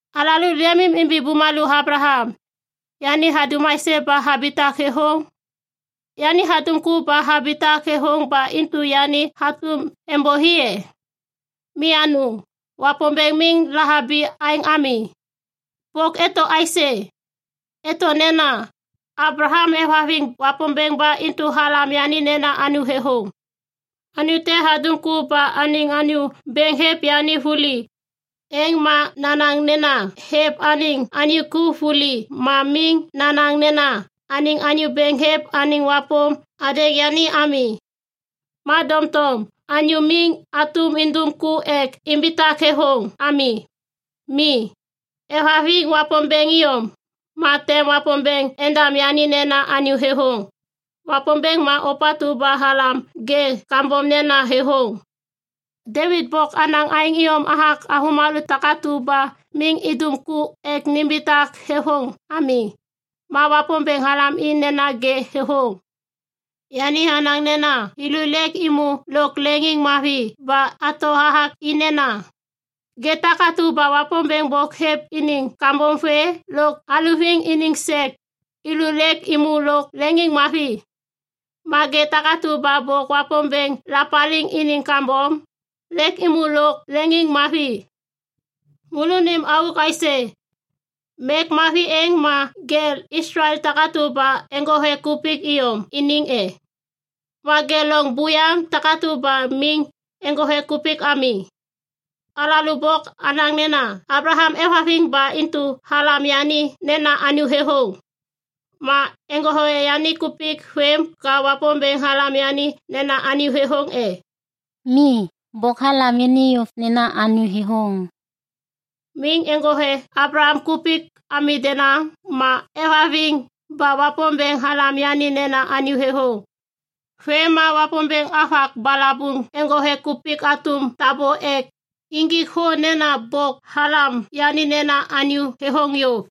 Alalô leŋiŋimbi bumalô Ablaham. Yani hadum aisê ba habitak thêthôŋ? Yani hadum ku ba habitak thêthôŋ ba intu yani hatôm êmbôi, e? Mi anôŋ, Wapômbêŋ miŋ lahabi aêŋ ami. Bôk eto aisê? Eto nena, “Ablaham hêvhaviŋ Wapômbêŋ ba intu halam yani nena anyô thêthôŋ.” Anyô te hadum ku ba anêŋ anyô bêŋ hêv yani vuli, êŋ ma nanaŋ nena hêv anêŋ anyô ku vuli ma miŋ nanaŋ nena anêŋ anyô bêŋ hêv anêŋ wapôm hadêŋ yani ami. Ma doŋtom anyô miŋ hatôm indum ku ek imbitak thêthôŋ ami. Mi, hêvhaviŋ Wapômbêŋ iyom, ma tem Wapômbêŋ endam yani nena anyô thêthôŋ. Wapômbêŋ ma ôpatu ba halam ŋê kambom nena thêthôŋ. Devit bôk hanaŋ aêŋ iyom hathak avômalô takatu ba miŋ idum ku ek nimbitak thêthôŋ ami, ma Wapômbêŋ halam i nena ŋê thêthôŋ. Yani hanaŋ nena thêlô lêk êmô lôk leŋiŋmavi ba hato hathak i nena, “Ŋê takatu ba Wapômbêŋ bôk hêv iniŋ kambom vê lôk haluviŋ iniŋ sek, thêlô lêk êmô lôk leŋiŋmavi. Ma ŋê takatu ba bôk Wapômbêŋ lapaliŋ iniŋ kambom, lêk êmô lôk leŋiŋmavi.” Môlônim auk aisê? Mek mavi êŋ ma ŋê Islael takatu ba eŋgothe kupik iyom iniŋ e? Ma ŋê loŋ buyaŋ takatu ba miŋ eŋgothe kupik ami? Alalô bôk anaŋ nena Ablaham hêvhaviŋ ba intu halam yani nena anyô thêthôŋ. Ma eŋgothe yani kupik vêm ka Wapômbêŋ halam yani nena anyô thêthôŋ e? Mi, bôk halam yani yôv nena anyô thêthôŋ. Miŋ eŋgothe Ablaham kupik ami denaŋ ma hêvhaviŋ ba Wapômbêŋ halam yani nena anyô thêthôŋ. Vêm ma Wapômbêŋ havak balabuŋ neŋgothe kupik hatôm tabô ek injik thô nena bôk halam yani nena anyô thêthôŋ yôv.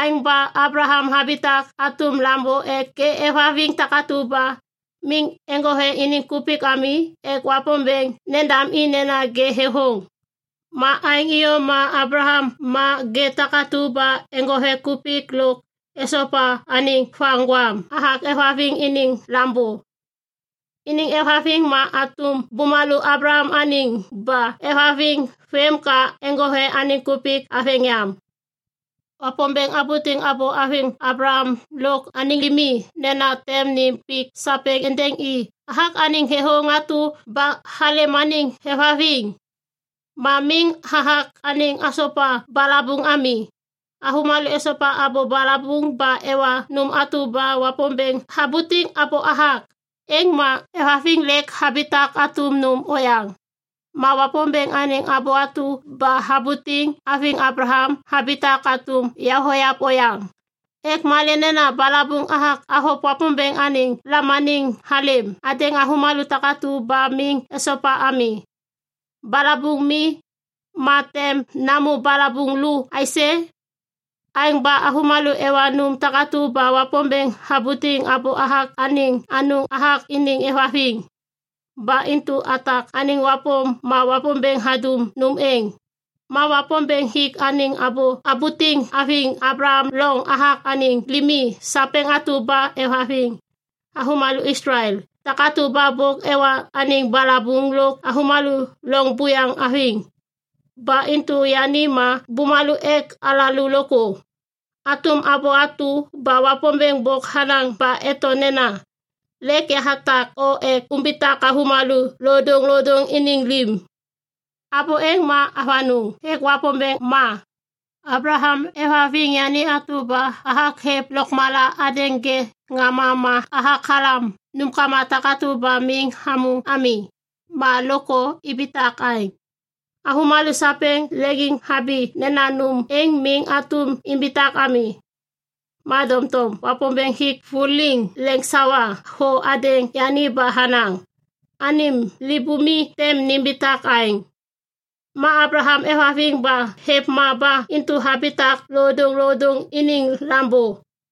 Aêŋ ba Ablaham habitak hatôm Lambô ek ŋê êvhaviŋ takatu ba miŋ eŋgothe iniŋ kupik ami ek Wapômbêŋ endam i nena ŋê thêthôŋ. Ma aêŋ iyom ma Ablaham ma ŋê takatu ba eŋgothe kupik lôk esopa anêŋ vaŋgwam hathak êvhaviŋ iniŋ lambô. Iniŋ êvhaviŋ ma hatôm bumalô Ablaham anêŋ ba hêvhaviŋ vêm ka eŋgothe anêŋ kupik haveŋ yam. Wapômbêŋ habutiŋ abô haviŋ Ablaham lôk anêŋ limi nena tem nêm pik sapêŋ êndêŋ i hathak anêŋ thêthôŋ atu ba halêm anêŋ hêvhaviŋ. Ma miŋ hathak anêŋ hasopa balabuŋ ami. Avômalô esopa abô balabuŋ ba ewa nôm atu ba Wapômbêŋ habutiŋ abô hathak, êŋ ma êvhaviŋ lêk habitak hatôm nôm oyaŋ. Ma Wapômbêŋ anêŋ abô atu ba habutiŋ haviŋ Ablaham habitak hatôm yavoyav oyaŋ. Ek malê nena balabuŋ hathak havôv Wapômbêŋ anêŋ lamaniŋ halêm hadêŋ avômalô takatu ba miŋ esopa ami. Balabuŋ mi, ma tem namô balabuŋ lu aisê? Aêŋ ba avômalô ewa nôm takatu ba Wapômbêŋ habutiŋ abô hathak anêŋ anôŋ hathak iniŋ êvhaviŋ. Ba intu hathak anêŋ wapôm ma Wapômbêŋ hadum nôm êŋ. Ma Wapômbêŋ hik anêŋ abô habutiŋ haviŋ Ablaham loŋ hathak anêŋ limi sapêŋ atu ba êvhaviŋ, avômalô Islael takatu ba bôk ewa anêŋ balabuŋ lôk avômalô loŋ buyaŋ haviŋ. Ba intu yani ma bumalô ek alalô lôkthô. Hatôm abô atu ba Wapômbêŋ bôk hanaŋ ba eto nena, “Lêk yahatak o ek umbitak avômalô lodôŋlodôŋ iniŋ lim.” Abô êŋ ma avanôŋ hêk Wapômbêŋ ma. Ablaham hêvhaviŋ yani atu ba hathak hêv lôkmala hadêŋ ŋê ŋama ma hathak halam nômkama takatu ba miŋ hamô ami, ma lôkthô ibitak aêŋ. Avômalô sapêŋ leŋiŋhabi nena nôm êŋ miŋ hatôm imbitak ami. Ma doŋtom Wapômbêŋ hik vuliŋ leŋsawa thô hadêŋ yani ba hanaŋ, “Anêm libumi tem nimbitak aêŋ.” Ma Ablaham hêvhaviŋ ba hêv ma ba intu habitak lodôŋlodôŋ iniŋ lambô.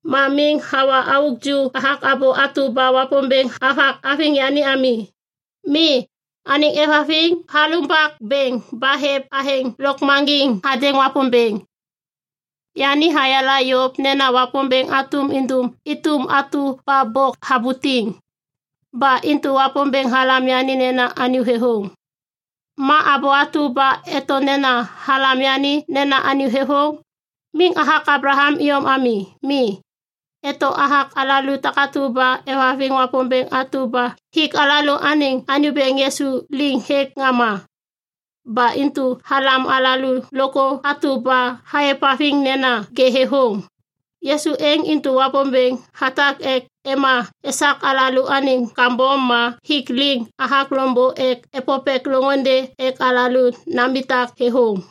Ma miŋ hawa auk ju hathak abô atu ba Wapômbêŋ havak haviŋ yani ami. Mi, anêŋ hêvhaviŋ halumbak bêŋ ba hêv athêŋ lôkmaŋgiŋ hadêŋ Wapômbêŋ. Yani hayala yôv nena Wapômbêŋ hatôm indum êtôm atu ba bôk habutiŋ. Ba intu “Wapômbêŋ halam yani nena anyô thêthôŋ.” Ma abô atu ba eto nena “halam yani nena anyô thêthôŋ,” miŋ hathak Ablaham iyom ami. Mi, eto hathak alalô takatu ba êvhaviŋ Wapômbêŋ atu ba hik alalôaniŋ Anyô Bêŋ Yisu liŋ hêk ŋama. Ba intu halam alalô lôkthô atu ba aêvhaviŋ nena ŋê thêthôŋ. Yisu êŋ intu Wapômbêŋ hatak ek ema esak alalôaniŋ kambom ma hik liŋ hathak loŋbô ek êpôpêk loŋôndê ek alalô nambitak thêthôŋ.